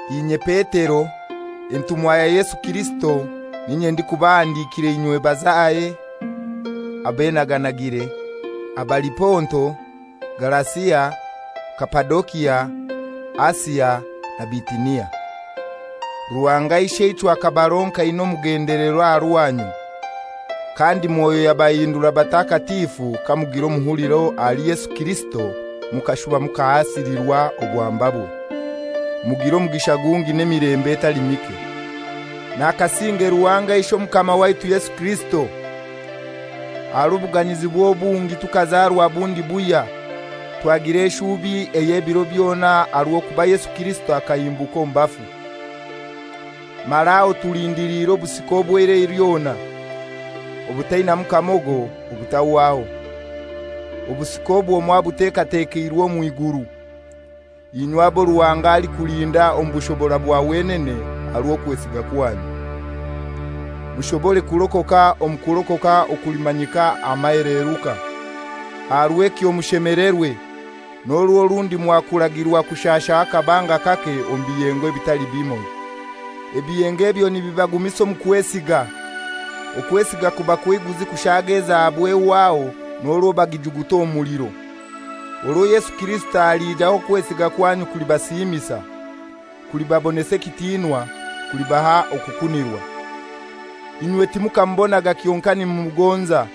Inye Petero, entumwa ya Yesu Kirisito, n'inye ndikubahandikira inywe bazahe abenaganagire, abali Ponto, Galasia, Kapadokia, Asia na Bitinia. Ruhanga Isheichwe akabaronka aina omugendelero aha rwanyu, kandi Mwoyo yabahindura batakatifu kamugira omuhuliro ahali Yesu Kirisito mukashuba mukahasilirwa obwambabwe. Mugire omugisha gungi n'emilembe etali mike. Nakasinge Ruhanga Ishe Omukama waitu Yesu Kirisito! Aha rw'obuganyizibwe obungi tukazarwa bundi buhya, twagira eshubi ey'ebiro byona aha rw'okuba Yesu Kirisito akahimbuka omu bafu. Mara aho tulindiliire obusika obw'eira lyona, obutainamu kamogo, obutahwaho. Obusika obwo mwabutekatekeirwe omw'iguru, inywe abo Ruhanga alikulinda omu bushobora bwa wenene aha rw'okwesiga kwanyu, mushobore kurokoka omu kurokoka okulimanyika aha maheleruka. Aha rw'ekyo mushemelerwe, n'orwo rundi mwakuragirwa kushashaho akabanga kake omu biyengo ebitali bimoi. Ebiyengo ebyo nibibagumisa omu kwesiga, okwesiga kuba kw'eiguzi kushaaga ezahabu ehwaho n'orwo bagijuguta omu muliro. Orwo Yesu Kirisito aliija okwesiga kwanyu kulibasiimisa, kulibabonesa ekitinwa, kulibaha okukunirwa. Inywe timukamubonaga kyonkai nimumugonza.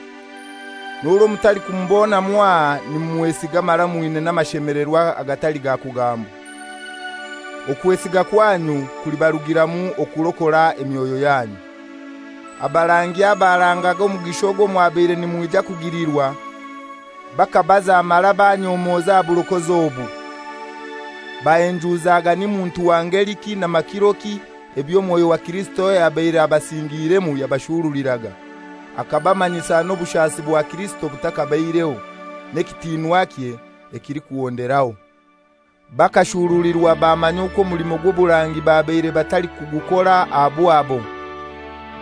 N'orwo mutalikumubona mwaha nimumwesiga mara mwina n'amashemelerwa agatali ga kugambwa. Okwesiga kwanyu kulibarugiramu okurokora emyoyo yanyu. Abarangi abarangaga omugisha ogwo mwabaire nimwija kugilirwa, bakabaza mara banyomoza aha burokozi obu. Bahenjuzaga ni muntu wa ngeliki n'amakiroki ebyo Mwoyo wa Kirisito ayabaire abasingiiremu yabashuruliraga, akabamanyisa n'obushasi bwa Kirisito butakabaireho, n'ekitinwakye ekilikuhonderaho. Bakashuruliwa bamanya okwo omulimo gw'oburangi babaire batalikugukora aha bwabo;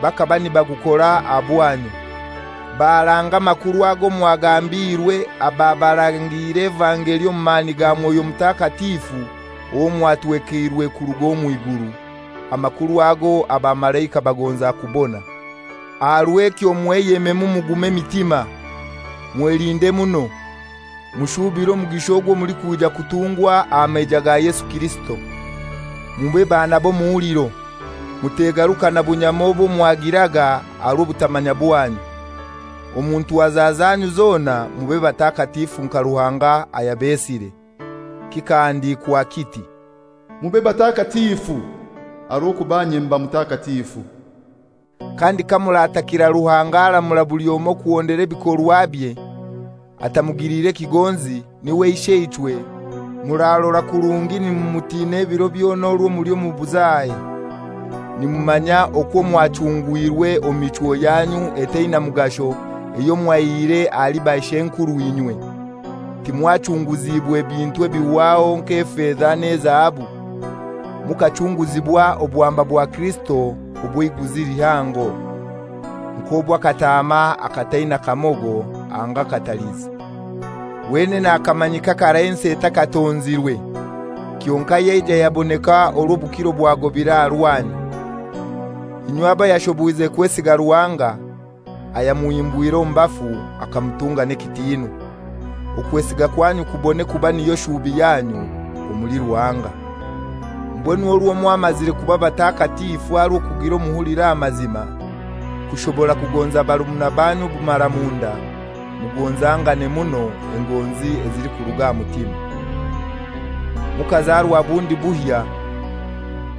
bakaba nibagukora aha bwanyu, baranga amakuru ago mwagambiirwe ababarangiire evangeli omu mani ga Mwoyo Mutakatifu owo mwatwekeirwe kuruga omw'iguru, amakuru ago abamalaika bagonza kubona. Aha rw'ekyo mweyememu mugume emitima, mwelinde muno, mushubire omugisha ogwo mulikwija kutungwa aha maija ga Yesu Kirisito. Mube baana b'omuhuliro, mutegarukana bunyama obwo mwagiraga aha rw'obutamanya bwanyu. Omu ntwaza zanyu zona mube batakatifu nka Ruhanga ayabesire. Kikahandikwa kiti, «Mube batakatifu, aha rw'okuba inye mba Mutakatifu.» Kandi kamuratakira Ruhanga aramura buli omoi kuhondera ebikorwabye, atamugiliire kigonzi, niwe Isheichwe, murarora kurungi nimumutina ebiro byona orwo muli omu buzahe. Nimumanya okwo mwachungwirwe omu michwo yanyu etaina mugasho eyo mwaihire ahali bashw'enkurw'inywe. Timwachunguziibwe bintu ebihwaho nk'efeza n'ezahabu; mukachunguzibwa obwamba bwa Kirisito obw'eiguzi lihango, nk'obw'akataama akataina kamogo anga katalizi. Wenene akamanyika karai ensi etakatonzirwe, kyonkai yaija yaboneka orwo obukiro bwagobire aha rwanyu, inywe abo yashoboize kwesiga Ruhanga, ayamuhimbwire omu bafu akamutunga n'ekitiinwa, okwesiga kwanyu kubone kuba niyo shubi yanyu omuli Ruhanga. Mbwenu orwo mwamazire kuba batakatifu aha rw'okugira omuhuliro aha mazima, kushobora kugonza barumuna baanyu obumaramunda, mugonzangane muno engonzi ezilikuruga aha mutima. Mukazarwa bundi buhya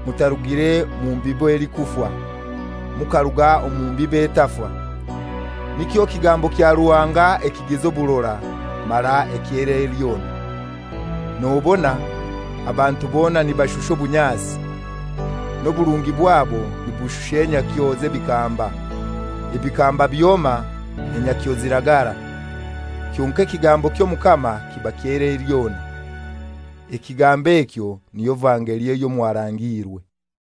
mutarugire mu mbibo elikufa, mukaruga omu mbibo etafa, nikyo kigambo kya Ruhanga ekigiza oburora mara eky'eirai lyona. Nobona, «Abantu bona nibashusha obunyasi, n'oburungi bwabo nibushusha enyakyo z'ebikamba, ebikamba byoma, enyakyo ziragara, kyonkai ekigambo ky'Omukama kiba ky'eirai lyona.» Ekigambo ekyo niyo vangeli eyo mwarangiirwe.